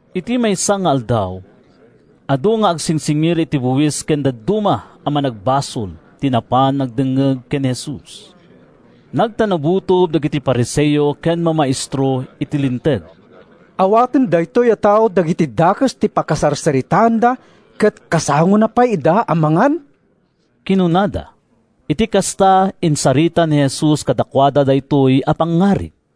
Iti maysa nga aldaw, adu nga agsingsingir iti buis ken dadduma a managbasol ti napan nagdengngeg ken ni Jesus. Nagtanabutob dagiti Fariseo ken mamaestro iti Linteg. “Awaten daytoy a tao dagiti dakes ti pakasarsaritaanda ket kasangona pay ida a mangan!” kinunada. Iti kasta, insarita ni Jesus kadakuada daytoy a pangngarig: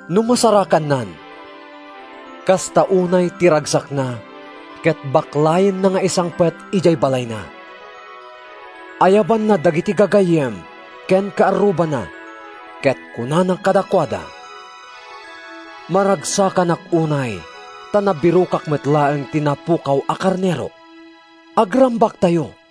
No masarakannan, kasta unay ti ragsakna ket baklayenna nga isangpet idiay balayna. Ayabanna dagiti gagayyem ken kaarrubana ket kunana kadakuada, ‘Maragsakanak unay ta nabirokak met laeng ti napukaw a karnerok! Agrambaktayo!’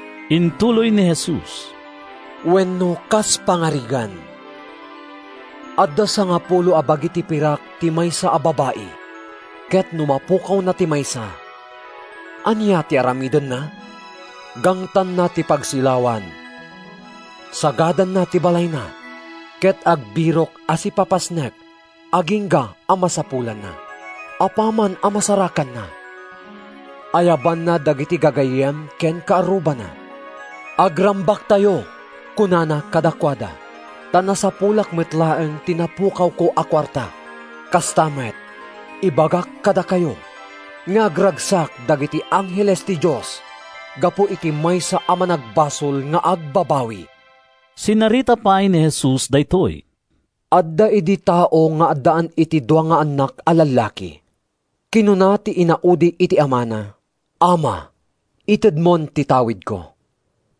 Intuloy ni Jesus, “Wenno kas pangarigan, adda sangapulo a bagi ti pirak ti maysa a babai, ket no mapukawna ti maysa, ania ti aramidenna? Gangtanna ti pagsilawan, sagadanna ti balayna, ket agbirok a sipapasnek agingga a masapulanna. Apaman a masarakanna, ayabanna dagiti gagayyem ken kaarrubana. ‘Agrambaktayo,’ kunana kadakuada, ‘ta nasapulak met laeng ti napukawko a kuarta.’ “Kasta met, ibagak kadakayo, nga agragsak dagiti angheles ti Dios gapu iti maysa a managbasol nga agbabawi.” Sinarita pay ni Jesus daytoy: “Adda idi tao nga addaan iti dua nga annak a lallaki. Kinuna ti inaudi iti amana, ‘Ama, itedmon ti tawidko.’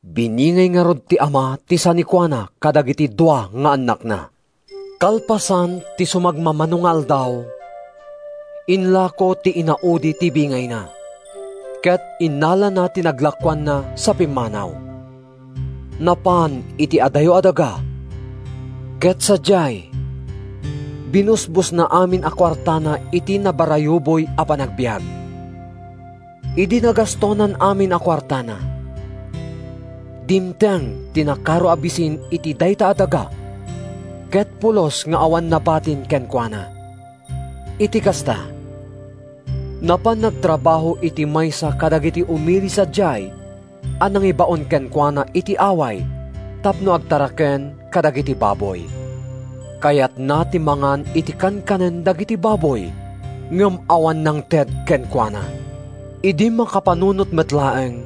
Biningay ngarud ti ama ti sanikuana kadagiti dua nga annakna. Kalpasan ti sumagmamano nga aldaw, inlako ti inaudi ti bingayna, ket innalana ti naglakoanna sa pimmanaw. Napan iti adayo a daga ket sadiay binusbosna amin a kuartana iti nabarayuboy a panagbiag. Idi nagastonan amin a kuartana, dimteng ti nakaro a bisin iti dayta a daga ket pulos nga awan nabatin kenkuana. Iti kasta, napan nagtrabaho iti maysa kadagiti umili sadiay a nangibaon kenkuana iti away tapno agtaraken kadagiti baboy. Kayatna ti mangan iti kankanen dagiti baboy, ngem awan nangted kenkuana! Idi makapanunot met laeng,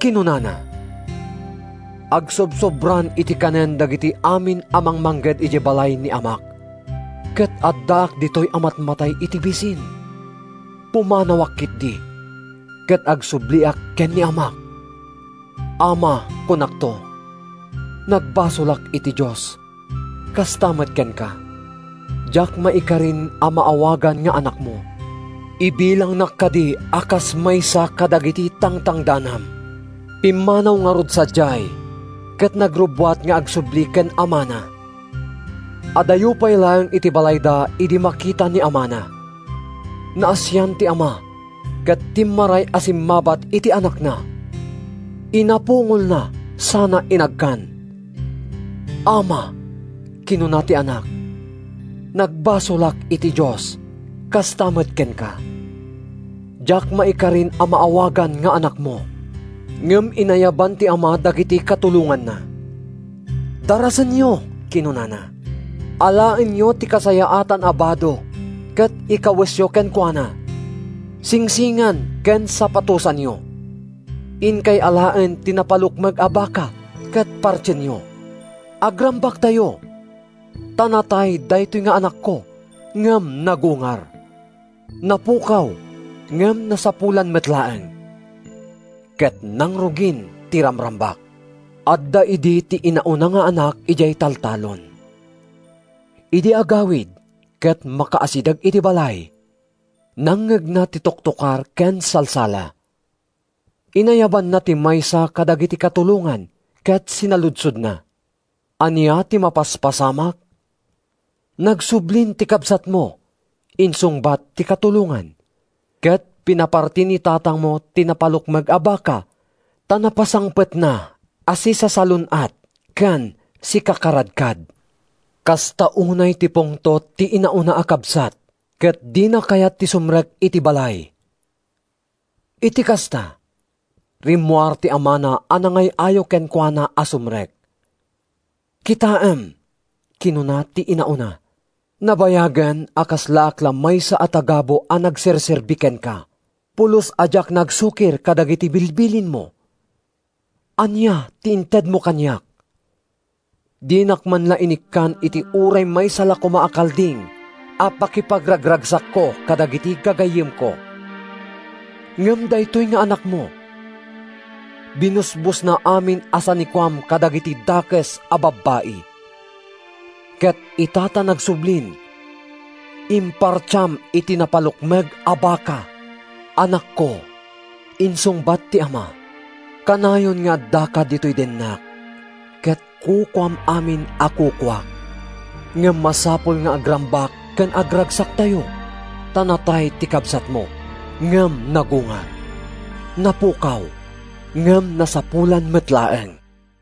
kinunana, ‘Agsobsobraan iti kanen dagiti amin a mangmangged idiay balay ni amak, ket addaak ditoy a matmatay iti bisin! Pumanawak ketdi ket agsubliak ken ni amak. Ama, kunakto, nagbasolak iti Dios, kasta met kenka. Diak maikarin a maawagan nga anakmo. Ibilangnak kadi a kas maysa kadagiti tangtangdanam.’ Pimmanaw ngarud sadiay ket nagrubbuat nga agsubli ken amana. “Adayo pay laeng iti balayda idi makita ni amana. Naasian ti ama ket timmaray a simmabat iti anakna. Inapungolna sana inagkan. ‘Ama,’ kinuna ti anak, ‘nagbasolak iti Dios, kasta met kenka. Diak maikarin a maawagan nga anakmo.’ Ngem inayaban ti ama dagiti katulonganna. ‘Darasenyo!’ kinunana. ‘Alaenyo ti kasayaatan a bado ket ikawesyo kenkuana. Singsingan ken sapatosanyo. Inkay alaen ti napalukmeg a baka ket partienyo. Agrambaktayo! Ta natay daytoy nga anakko, ngem nagungar. Napukaw ngem nasapulan met laeng.’ Ket nangrugin ti ramrambak. “Adda idi ti inauna nga anak idiay taltalon. Idi agawid ket makaasideg iti balay, nangngegna ti toktokar ken salsala. Inayabanna ti maysa kadagiti katulongan ket sinaludsodna, ‘Ania ti mapaspasamak?’ ‘Nagsublin ti kabsatmo,’ insungbat ti katulongan, ‘ket pinaparti ni tatangmo ti napalukmeg a baka, ta napasangpetna a sisasalun-at ken sikakaradkad.’ Kasta unay ti pungtot ti inauna a kabsat ket dina kayat ti sumrek iti balay. Iti kasta, rimmuar ti amana a nangay-ayo kenkuana a sumrek. ‘Kitaem,’ kinuna ti inauna, ‘nabayagen a kaslaak la maysa a tagabu a nagserserbi kenka. Pulos a diak nagsukir kadagiti bilbilinmo. Ania ti intedmo kaniak? Dinak man la inikkan iti uray maysa la koma a kalding a pakipagragragsakko kadagiti gagayyemko. Ngem daytoy nga anakmo—binusbosna amin a sanikuam kadagiti dakes a babbai. Ket ita ta nagsublin, impartiam iti napalukmeg a baka!’ ‘Anakko,’ insungbat ti ama, ‘kanayon nga addaka ditoy dennak, ket kukuam amin a kukuak. Ngem masapul nga agrambak ken agragsaktayo, ta natay ti kabsatmo ngem nagungar. Napukaw ngem nasapulan met laeng.’”